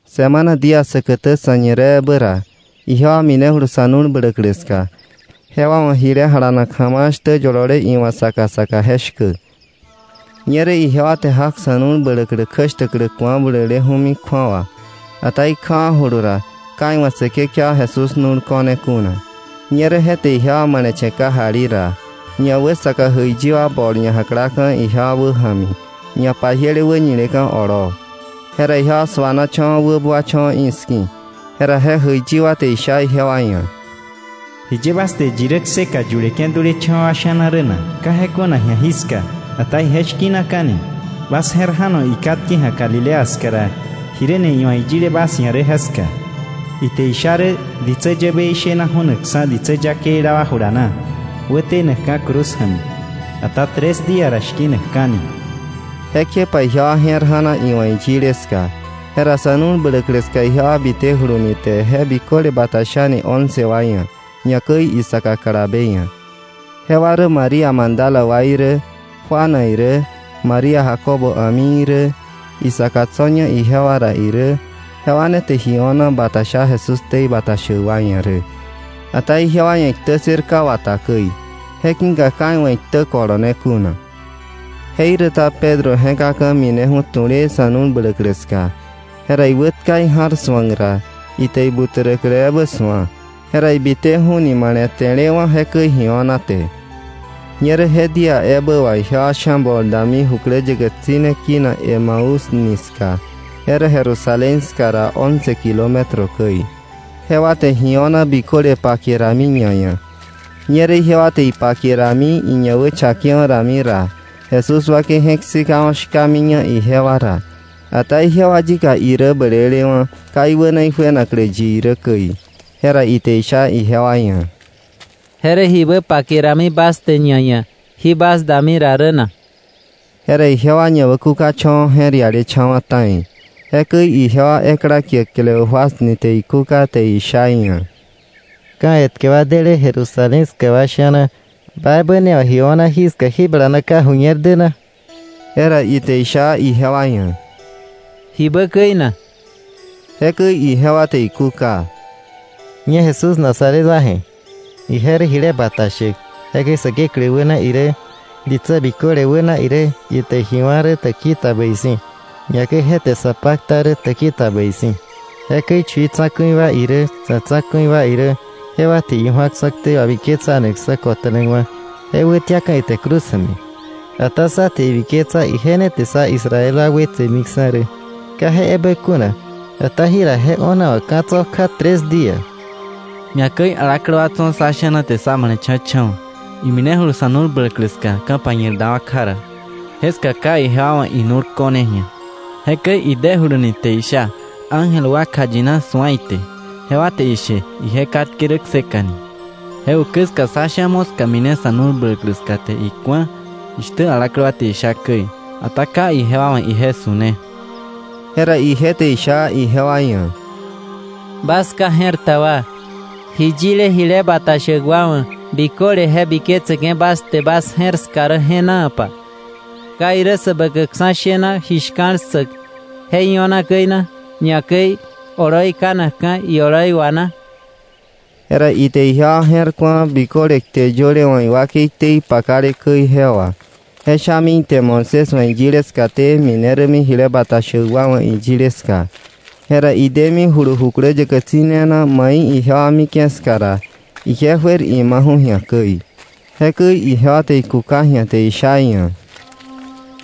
Semana día säkätä sa̱ñireebä ra, ijewa minejulu sa̱ nu̱l bläklä ska, jewa wa̱ ji jalanak ja̱ma̱a̱ shtä yolole iwa̱ saka saka je shkä. Ñerä ijewa te jak sa̱ nu̱l bläklä kjäshtäklä ku̱a buleleju̱mi kju̱awa, ata ikjawa̱julu ra, ka iwa̱ Säkekewa Jesús nu̱l ko̱ne kuna. Ñerä je te ijewa male̱che̱ kajali ra, ñawäsaka jäiyi wa bol ñajaklaka̱ ijewa wäja̱mi ñapajiele wäñileka̱ olóo. Jera ijewa suanacha̱wa̱ wäbuacha̱wa̱ i̱ski̱. Jera je jäiyi wa te isha ijewa ia̱: —¿Jiye bas te yi rä kseka yuleke̱ dulecha̱wa̱ wa sha̱na rä na? Ka je kuna ji̱a jiska, ata ije shki̱naka̱ni. Bas je̱r ja̱no ikatke ji̱a Galilea ska ra jiräni iwa̱ iyile bas ia̱ rä jeska. Ite isha rä ditsä yäbei shena ju̱nakksa̱ ditsä yakeila wa jula na wätenakka̱ cruz ja̱mi, ata tres día ra shki̱nakka̱ni. Jekjepa ijewa je̱r ja̱na iwa̱ iyile ska. Jera sa̱ nu̱l bläklä ska ijewa bitejuluni te je biköle bata shani once wa ia̱, ñakäi isaka kalabe ia̱. Jewa rä María Magdala wa irä, Juana irä, María Jacobo a̱mi irä, isaka tso̱ña ijewa ra irä; jewa ne te ji o̱na bata sha Jesús ktei bata shäk wa ia̱ rä. Ata ijewa ia̱ iktä ssër ka wata käi, je ki̱ka ka iwa̱ iktä kolone kuna. Jeiräta Pedro je̱kaka̱ mineju̱ tu̱lee sa̱ nu̱l bläklä ska. Jera iwätka ija̱r su̱ak ra, ite ibuträklä ebä su̱a. Jera ibiteju̱ni male̱te̱lewa̱ jekäi ji o̱na te. Ñerä je día ebä wà ijewa sha̱ bol dami jukläyäkä tsi̱ne kinak Emaús nika, je rä Jerusalén ska ra once kilómetro käi. Jewa te ji o̱na biköle pake rami ñaia̱. Ñerä ijewa te ipake rami, iñawächakewa̱ rami ra, Jesús wakei je̱k sikawa̱ shkamiña ijewa ra. Ata ijewa yika irä blelewa̱, ka iwäna ijuenaklä yi irä käi. Jera ite isha ijewa ia̱: —¿Je rä jibä pake rami bas te ñaia̱ jí bas dami ra rä na? Jera ijewa ñawäkukacha̱wa̱ je̱r ialecha̱wa̱ ta̱i. Jekäi ijewa ekla kie Cleofas ni te ikúka te isha iia̱: —¿Ka̱ etkä wa déle Jerusalén ska wa sha̱na, ba ebä ne wa̱ ji o̱na jeska jí bala na ka ju̱ñer dä na? Jera ite isha ijewa ia̱: —¿Jibä käi na? Jekäi ijewa te ikúka: —Ñe Jesús Nazaret wa je̱. Ije rä jile bata shäk, jekäi Säkeklä wäna irä, ditsä biköle wäna irä ite ji wá̱ rä täkili ta bäi si̱, ñakäi je te sa pakta rä täki ta bäi si̱. Jekäi chui tsa̱ku̱i wa irä, sá tsa̱ku̱i wa irä, jewa te iju̱aksa̱ ktei wabiketsanakksa̱ kota̱nakwa̱, je wätiaka̱ ite cruz ja̱mi. Ata sá te ibiketsa ije ne te sá Israel wa wetsemiksa̱ rä. Ka je ebä kuna, ata jira je o̱na wa̱ ka̱ tso̱ kja tres día. Ñakäi alaklä wa tso̱ sá sha̱na jewa te sá male̱cha̱cha̱wa̱. Iminejulu sa̱ nu̱l bläklä ska, ka̱pañir dawa̱ kja ra, jeska ka ijewa wa̱ inu̱l ko̱ne ji̱a, jekäi idejuluni te isha ángel wa kjayina su̱a ite; jewa te ishe ije katke rä kseka ni. Je ukä ska sá sha̱ moska mine sa̱ nu̱l bläklä ska te iku̱a jishtä alaklä wa te isha käi, ata ka ijewa wa̱ ije su̱ne. Jera ije te isha ijewa ia̱: —Bas ka je̱r ta wa, ji yile jile bata shäk wa wa̱ biköle je biketseke̱ bas te bas je̱r ska rä je̱naapa. ¿Ka irä Säbäkäkksa̱ shena ji shka̱l ssäk je io̱na käi na, ñakäi oloi kanakka̱ ioloi wa na? Jera ite ijewa je̱r ku̱a biköle kte yöle wa̱ iwakei ktei pakale käi je wà. Je shami ite Moisés wa̱ iyile skaté mine rämi jile bata shäk wa wa̱ iyile ska. Jera idemijulu jukläyäkä tsi̱ne na mai ijewa mike̱ ska ra, ije juer imaju̱ ji̱a käi. Jekäi ijewa te ikúka ji̱a te isha iia̱: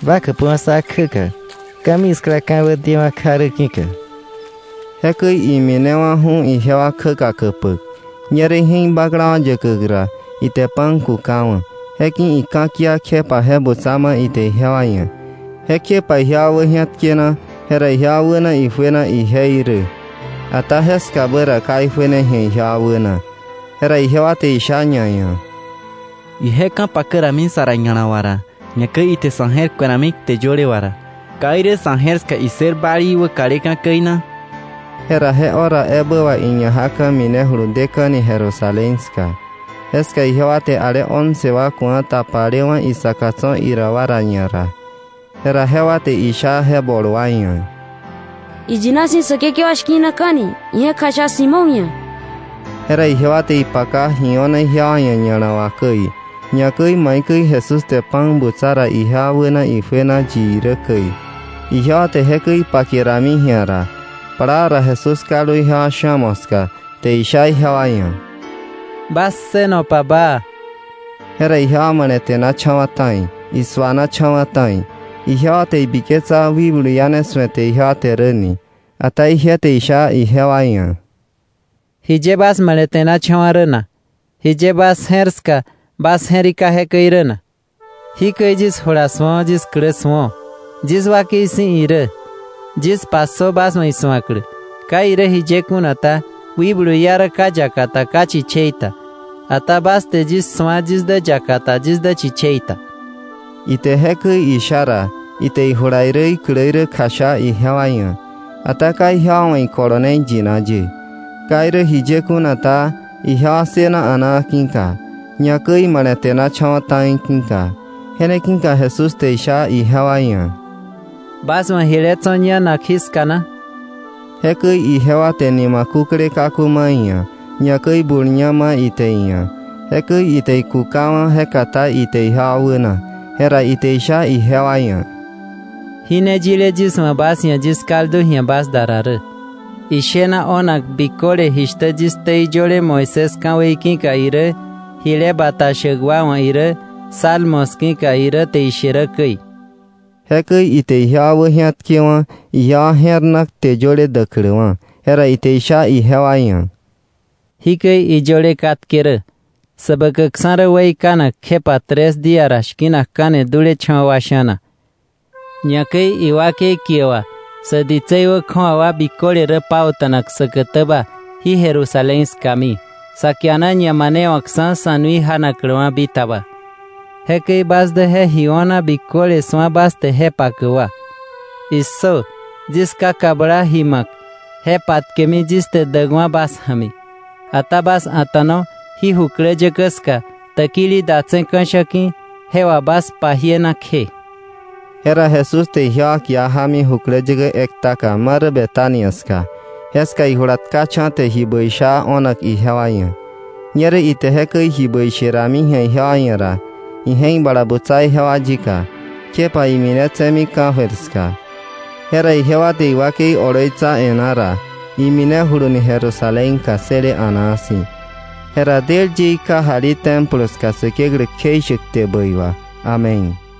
—Ba käpöwa̱ sá kjäka, ka̱miskla ka̱wä dewa̱ kja rä ki̱ka. Jekäi iminewa̱ju̱ ijewa kjäka käpäk. Ñerä ije̱k baklawa̱ yäkäk ra, ite pan kukawa̱. Jeki̱ ika̱kia, kjepa je butsa ma ite ijewa ia̱. Jekjepa ijewa wäji̱atkena, jera ijewa wäna ijuena ije irä. Ata jeskabä ra ka ijuene ji̱a ijewa wäna. Jera ijewa te isha ñaia̱: —Ije ka̱pakä rami sa ra ña̱la wà ra, ñakäi ite sa̱ je̱r ku̱e rami kte yöle wa ra, ¿ka irä sa̱ je̱r ska issër balii wäkaleka̱ käi na? Jera je hora ebä wà iña jaka̱ bitejulu deka̱ni Jerusalén ska, jeska ijewa te ale once wa ku̱a tapalewa̱ isaka tso̱ ira wa ra ñara, jera jewa te isha je bol wa ia̱: —¡Iyina si̱ Säkekewa shki̱naka̱ni! Ije̱k kjasha Simón ia̱. Jera ijewa te ipaka ji o̱na ijewa ia̱ ña̱la wà käi, ñakäi maikäi Jesús te pan butsa ra ijewa wäna ijuena yi irä käi. Ijewa te jekäi ipake rami ji̱a ra, plaa ra Jesús kaldu ijewa sha̱ moska, te isha ijewa ia̱: —Bas ssënopa baa. Jera ijewa male̱te̱nacha̱wa̱ ta̱i, isuanacha̱wa̱ ta̱i. Ijewa te ibiketsa wikblu iá ne su̱ete ijewa te rä ni. Ata ije te isha ijewa ia̱: —¿Jiye bas male̱te̱nachawa̱ rä na? ¿Jiye bas je̱r ska bas je̱rika jekäi rä na? Jikäi yis jula su̱o, yis klä su̱o. Yis wakei si̱ irä. Yis passö bas wa̱ isu̱aklä. Ka irä jiye kuna ta, wikblu iá rä ka yakata ka chichei ta, ata bas te yis su̱a yis dä yakata yis dä chichei ta. Ite jekäi isha ra, ite ijula irä iklä irä kjasha ijewa ia̱. Ata ka ijewa wa̱ ikolone iyina ye. Ka irä jiye kuna ta, ijewa ssëna a̱naa ki̱ka, ñakäi imale̱te̱nacha̱wa̱ ta̱i ki̱ka. Je ne ki̱ka Jesús te isha ijewa ia̱: —¿Bas wa̱ jile tso̱ ñanak jiska na? Jekäi ijewa te nima kúkle kaku ma iia̱, ñakäi bul ña ma ite iia̱. Jekäi ite ikukawa̱, je katá ite ijewa wäna. Jera ite isha ijewa ia̱: —Jí ne yile yis wa̱ bas ia̱ yis kaldu ji̱a bas da ra rä, ishena o̱nak biköle jishtä yis ktei yöle Moisés ka̱wei ki̱ka irä, jile bata shäk wa wa̱ irä, Salmos ki̱ka irä te ishe rä käi. Jekäi ite ijewa wäji̱atkewa̱ ijewa je̱r na kte yöle däkläwa̱, jera ite isha ijewa ia̱: —Jikäi iyöle katke rä: Säbäkäkksa̱ rä weikanak kjepa tres día ra shki̱nakka̱ni dulecha̱wa̱ wa sha̱na, ñakäi iwakei kie wà sä ditsei wä kju̱awa wa biköle rä pauta̱nak säkätäba jí Jerusalén skami sa kiana ñamanewakksa̱ sa̱ nui janakläwa̱ bitaba. Jekäi bas dä je ji o̱na biköle su̱a bas te je pakäk wa. ¡Issö! Yis Ká kabla ji ma̱k, je patkemi yis te däkwa̱ bas ja̱mi. Ata bas a̱ta̱no jí jukläyäkä ska täkili datse̱ ka̱sha̱ ki̱ je wà bas pajiena kje. Jera Jesús te ijewa kia ja̱mi jukläyäkä ektaka marä Betania ska, jeska ije jula tkacha̱ te ji bäi sha o̱nak ijewa ia̱. Ñerä ite jekäi ji bäi sherami ji̱a ijewa ia̱ ra, ije̱k bala butsa ijewa yika, kjepa iminetse̱mi ka̱jöir ska. Jera ijewa te iwakei oloitsa e̱ná ra, iminejulu ni Jerusalén ka ssële a̱naa si̱. Jera del ye ikajali Templo ska Säkeklä kjeishäk kte bäi wà. Amén.